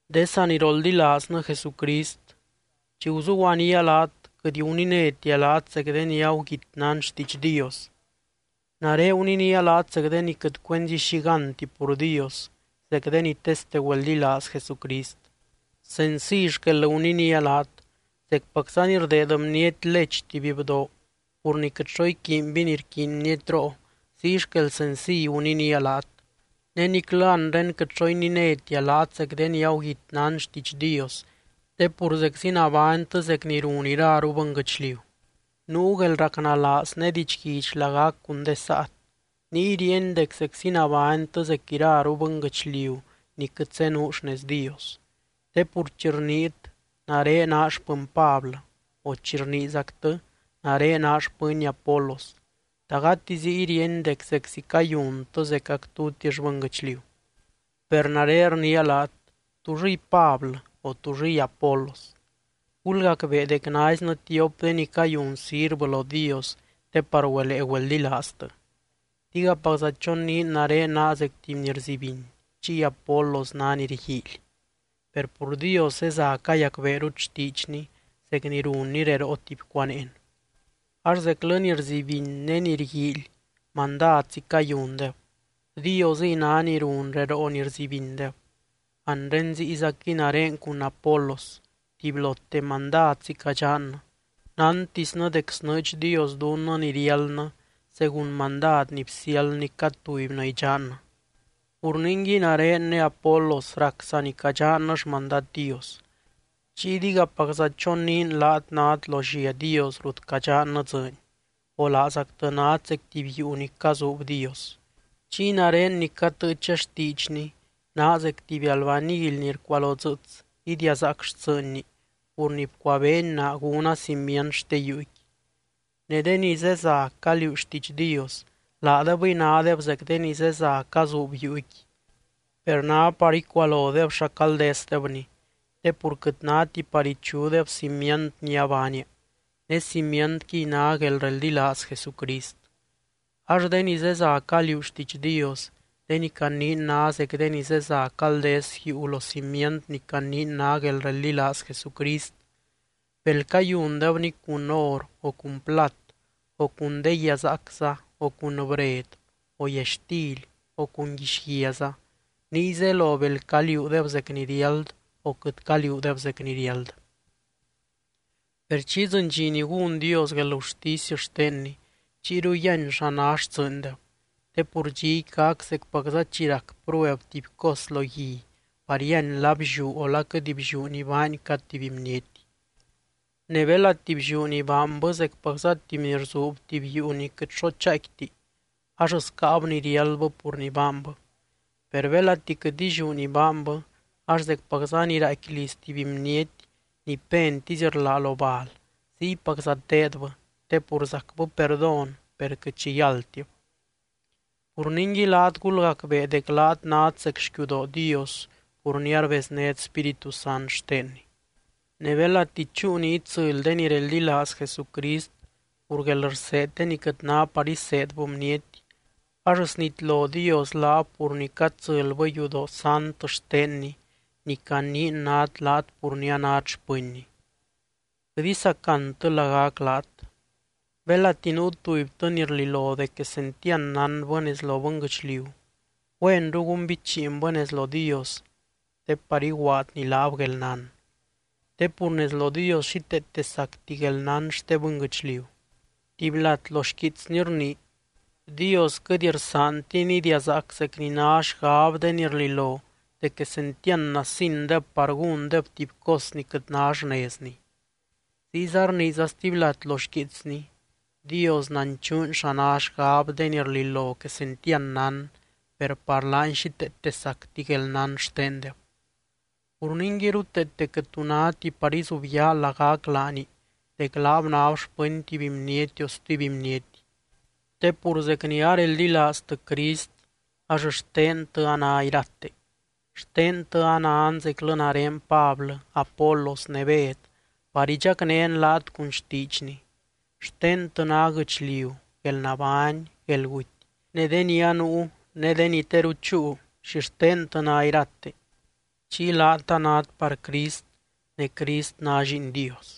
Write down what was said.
De saniroldilaaznɨ Jesucrist, chi guzuguanía laat quɨt guninétia laat zec de ni aguguit nán xtiidx Dios, nare guninía laat zec de ni quɨt cuenzi xi gánti pur Dios, zec de ni teste güeldilaaz Jesucrist. Senciy xquel guninía laat, zecpacza ni rdeed bniety lech tuby bdoo pur ni quɨt xo iquiinby ni rquiiny bnietroo, ziy xquel senciy guninía laat. Ne niclɨ anre quɨt xo ininétia laat zec de ni aguguit nán xtiidx Dios, te pur zeczi nabánytɨ zec ni run iraru bɨnguɨchliu. Nuu guelracnalaaz ne didxguidx lagac cun de saat, niy ríeny dec zeczi nabánytɨ zec iraru bɨnguɨchliu ni quɨt zenuu xnez Dios. Te pur chi rniit: “Nare naa xpɨny Pablɨ”, o chi rniizactɨ: “Nare naa xpɨny Apolos”, ¿ta gati ziy ríeny dec zeczi cayuntɨ zecac tutix bɨnguɨchliu? Per nare rniia laat: ¿Túllɨy Pablɨ, o túllɨy Apolos? Gulgacbee dec naiznɨ tiop de ni cayun sirvɨ lo Dios te par güelee güeldilaaztɨ. Digapacza choniin nare naa zec tuby ni rzibiny chiy Apolos ná ni rguiily, per pur Dios zeza cayacbeerut xtiidxny zec ni runny reroo tuby cuaneen. Ax zeclɨ ni rzibiny ne ni rguiily mandadzi cayundeb, Diosɨy ná ni run reroo ni rzibindeb. Anre ziyzaquɨy nare cun Apolos tubylote mandadzi cadxannɨ, nántisnɨ dec snɨɨdx Dios dunnɨ ni riáldnɨ según mandad ni bsiáldny cad tubynɨ idxannɨ. Pur ningui nare ne Apolos rac saa ni cadxannɨ xmandad Dios. Chiy digapacza choniin laat nát lo llia Dios rut cadxannɨ dzɨɨny, o laazactɨ nát zec tuby yuu ni cazuub Dios. Chiy nare ni catɨɨcha xtiidxny naa zec tuby albanily ni rcualodzɨɨts idiazaac xtsɨɨnni pur ni bcuabeeny naa gúna cimient xte yuuqui. Ne de ni zeza caliuu xtiidx Dios, laadebɨy nádeb zec de ni zeza cazuub yuuqui. Per ná par icualodeb xa caldesdebni te pur quɨt náti par ichudeb cimient ni abaania, ne cimientquiy ná guelreldilaaz Jesucrist. Ax de ni zeza caliuu xtiidx Dios, de ni caniin ná zec de ni zeza caldes yuu lo cimient ni caniin ná guelreldilaaz Jesucrist, bel cayundebni cun or o cun plat o cun de guiazaacza o cun bred o yaxtily o cun guixguiaza, niy zelo bel caliuudeb zec ni riáld o quɨt caliuudeb zec ni riáld. Per chi idzɨny dxi ni gún Dios guelgurtisy xtenny, chiyru yíany xa ná xtsɨɨndeb. Te pur dxiqui gac zecpacza chi rac prueb tuby cos lo gui par yíany la blliú o la quɨt blliú ni baany cad tuby bniety. Ne belati blliú ni baanbɨ zecpacza tuby ni rzuub tuby yuu ni quɨt xo chaaicquiti, ax scáab ni riáldbɨ pur ni baanbɨ. Per belati quɨt illiú ni baanbɨ, ax zecpacza ni raaicqui liz tuby bniety ni pentisy rlá lo bal ziypacza teedbɨ, te pur zacbɨ perdón per quɨt xi yáldtib. Pur ningui laat gulgacbee dec laat nát zec xquiudoo Dios pur ni arbeznét Spíritu Sant xtenny. Ne belati chúu ni itsɨly de ni reldilaaz Jesucrist pur guelrseed de ni quɨt ná par iseedbɨ bniety, ax snitlo Dios laab pur ni catsɨlbɨ yudoo sant xtenny ni caniin nát laat pur ni anát xpɨnny. Quɨt isacantɨ lagac laat. Belati nuu tubytɨ ni rlilo dec quesentiand nánbɨ nez lo bɨnguɨchliu, güenru gúnbichiinbɨ nez lo Dios te par iguaadny laab guelnán. Te pur nez lo Dios xíteete sacti guelnán xte bɨnguɨchliu, tuby lat lo xquiitsny rnii: “Dios quɨt rsaantiny idiazaac zec ni ná xgab de ni rlilo dec quesentiand nasindeb par gúndeb tuby cos ni quɨt ná xnezni.” Ziyza rniiza stuby lat lo xquiitsny: “Dios nanchuuny xa ná xgab de ni rlilo quesentiand nán, per par laany xíteete sacti guelnán xtendeb.” Pur ningui ruteete quɨt tu náti par izubyaa lagac laani dec laab náb xpɨny tuby bniety o stuby bniety. Te pur zec ni areldilaaztɨ Crist ax xtentɨ a ná irate, xtentɨ anan zeclɨ nare Pablɨ, Apolos ne Bed par idxacnén laat cun xtiidxny. Xtentɨ ná guɨchliu, guelnabány, guelguty, ne de ni anuu ne de ni teru chúu, xixtentɨ ná irate. Chiy laat anát par Crist ne Crist ná Lliin Dios.